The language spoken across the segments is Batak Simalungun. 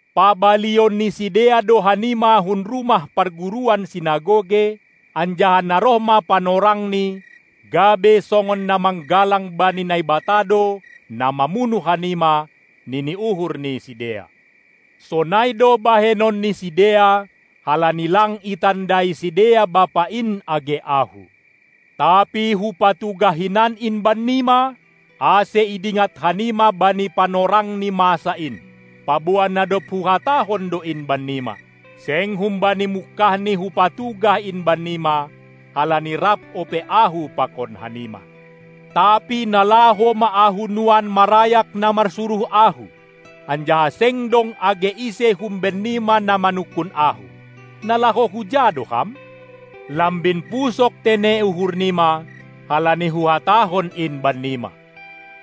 Pabalion ni sidea do hanima hun rumah parguruan (sinagoge), anjaha na roh ma panorangni gabe songon na manggalang bani Naibata do na mamunuh hanima, nini uhur ni sidea. Sonai do bahenon ni sidea halani lang itandai sidea Bapa in, age Ahu. Tapi Hupatugah hinan in bannima, ase idingat hanima bani panorangni masa in, paboa na dob Huhatahon do in bannima. Seng humbani mungkahni Hupatugah in bannima, halani rap ope Ahu pakon hanima. Tapi na laho ma Ahu nuan marayak na marsuruh Ahu, anjaha seng dong age ise humbennima na manungkun Ahu: Na laho huja do Ham? Lambin pusok tene uhur nima, halani Huhatahon in bannima.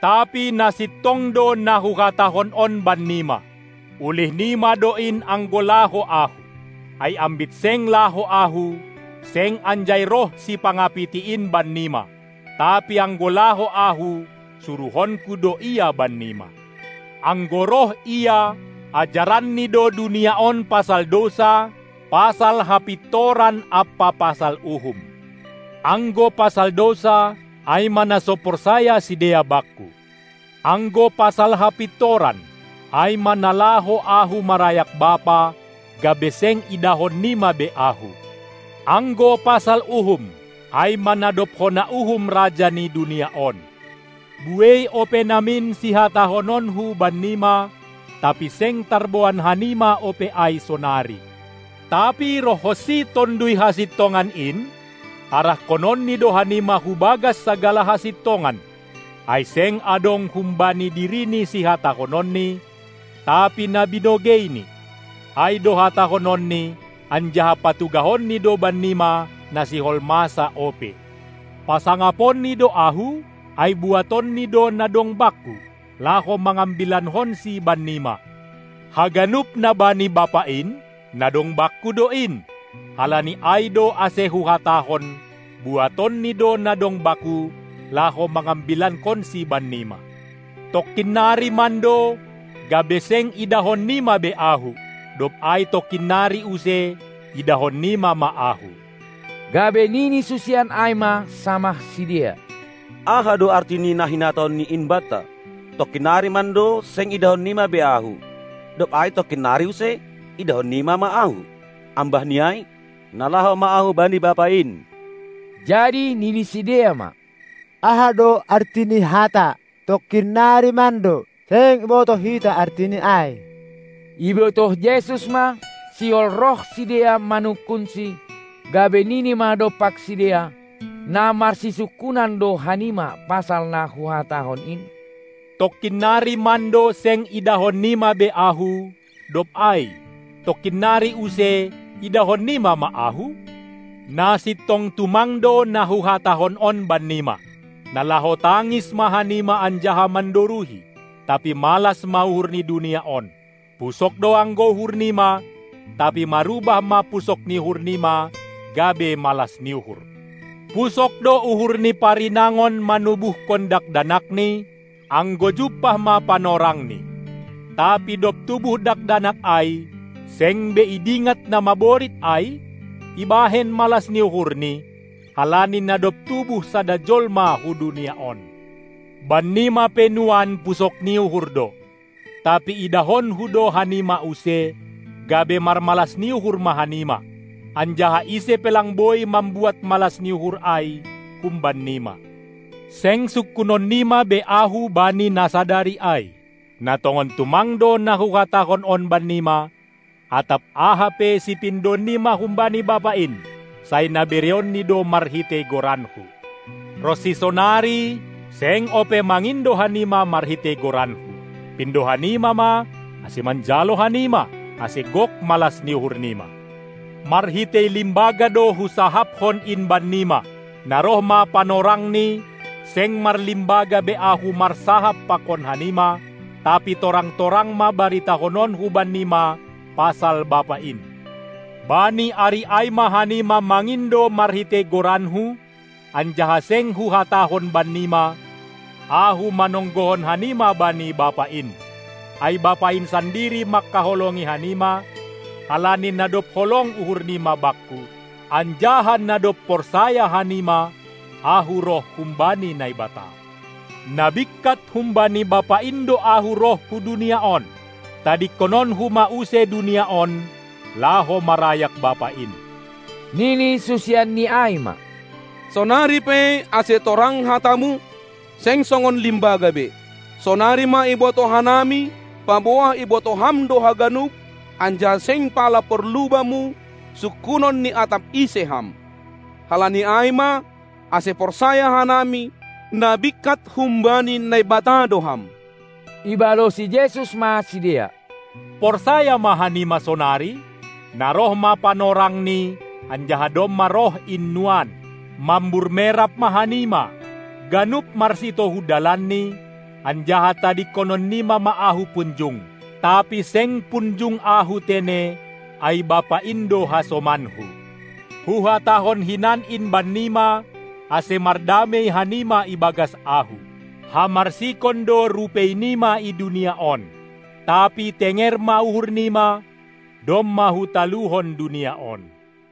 Tapi na sintong do na Huhatahon on bannima: Ulih nima do in anggo laho Ahu. Ai ambit seng laho Ahu, seng anjai roh Sipangapiti in bannima, tapi anggo laho Ahu, suruhonKu do Ia bannima. Anggo roh Ia, ajaranNi do dunia on pasal dousa, pasal hapintoran ampa pasal uhum. Anggo pasal dousa, ai ma na so porsaya sidea Bakku. Anggo pasal hapintoran, ai ma na laho Ahu marayak Bapa, gabe seng idahon nima be Ahu. Anggo pasal uhum, ai ma na dob hona uhum raja ni dunia on. Buei ope namin sihatahononKu bannima, tapi seng tarboan hanima ope ai sonari. Tapi rohhonsi Tonduy Hasintongan in, arahkononni do hanima hubagas sagala hasintongan; ai seng adong humbani Dirini sihatahononNi, tapi na binogeiNi, ai do hatahononNi, anjaha patugahonNi do bannima na sihol masa ope. PasangaponNi do Ahu, ai buatonNi do na dong Bakku, laho mangambilankonsi bannima. Haganup na bani Bapa in, na dong Bakku do in; halani ai do ase Huhatahon, buatonNi do na dong Bakku, laho mangambilankonSi bannima. Tongkin nari mando, gabe seng idahon nima be Ahu, dob ai tongkin nari use, idahon nima ma Ahu. Gabe nini susian ai ma samah sidea: Aha do arti ni na hinatahonNi in banta: Tongkin nari mando seng idahon nima be Ahu, dob ai tongkin nari use, idahonnima ma Ahu, ambah ni ai: Na laho ma Ahu bani Bapa in? Jadi nini sidea ma: Aha do artini hata: tongkin nari mando? Seng ibotoh hita artini ai. Ibotoh Jesus ma, sihol roh sidea manungkunsi, gabe nini ma dompak sidea: Na marsisungkunan do hanima pasal na Huhatahon in: Tongkin nari mando seng idahon nima be Ahu, dob ai: Tongkin nari use idahon nima ma Ahu? Na sintong tumang do na Huhatahon on bannima: Na laho tangis ma hanima anjaha mandoruhi, tapi malas ma uhur ni dunia on. Pusok do anggo uhur nima, tapi marubah ma pusok ni uhur nima gabe malas ni uhur. Pusok do uhur ni parinangon manubuhkon dakdanakni, anggo jumpah ma panorangni. Tapi dob tubuh dakdanak ai, seng be idingat na maborit ai, ibahen malas ni uhurni, halani na dob tubuh sada jolma hu dunia on. Bannima pe nuan pusok ni uhur do, tapi idahonKu do hanima use, gabe marmalas ni uhur ma hanima, anjaha ise pe lang boi mambuat malas ni uhur ai humban nima. Seng sungkunon nima be Ahu bani na sadari ai. Na tongon tumang do na Huhatahon on bannima: Atap aha pe sipindoon nima humbani Bapa in, sai na bereonNi do marhitei goranKu. Ronsi sonari seng ope mangindo hanima marhitei goranKu. Pindo hanima ma, ase manjalo hanima, ase gok malas ni uhur nima! Marhitei limbaga do Husahapkon in bannima. Na roh ma panorangni, seng marlimbaga be Ahu marsahap pakon hanima, tapi torang-torang ma baritahononKu bannima pasal Bapa in. Bani ari ai ma hanima mangindo marhitei goranKu, anjaha seng Huhatahon bannima, Ahu manonggohon hanima bani Bapa in, ai Bapa in sandiri mangkaholongi hanima, halani na dob holong uhur nima Bakku, anjaha na dob porsaya hanima, Ahu roh humbani Naibata. Na bingkat humbani Bapa in do Ahu roh hu dunia on; tadingkononKu ma use dunia on, laho marayak Bapa in. Nini susianNi ai ma: Sonari pe, ase torang hataMu, seng songon limbaga be. Sonari ma ibotoh hanami, paboa ibotoh Ham do haganup, anjaha seng pala porlu Bamu, sungkunon ni atap ise Ham. Halani ai ma, ase porsaya hanami, na bingkat humbani Naibata do Ham. Ibalosi Jesus ma sidea: Porsaya ma hanima sonari? Na roh ma panorangni anjaha domma roh in nuan, mambur merap ma hanima, ganup marsitohu dalanni, anjaha tadingkonon nima ma Ahu punjung; tapi seng punjung Ahu tene, ai Bapa in do hasomanKu. Huhatahon hinan in bannima, ase mardamei hanima ibagas Ahu. Hamarsikon do rupei nima i dunia on, tapi tenger ma uhur nima, domma Hutaluhon dunia on.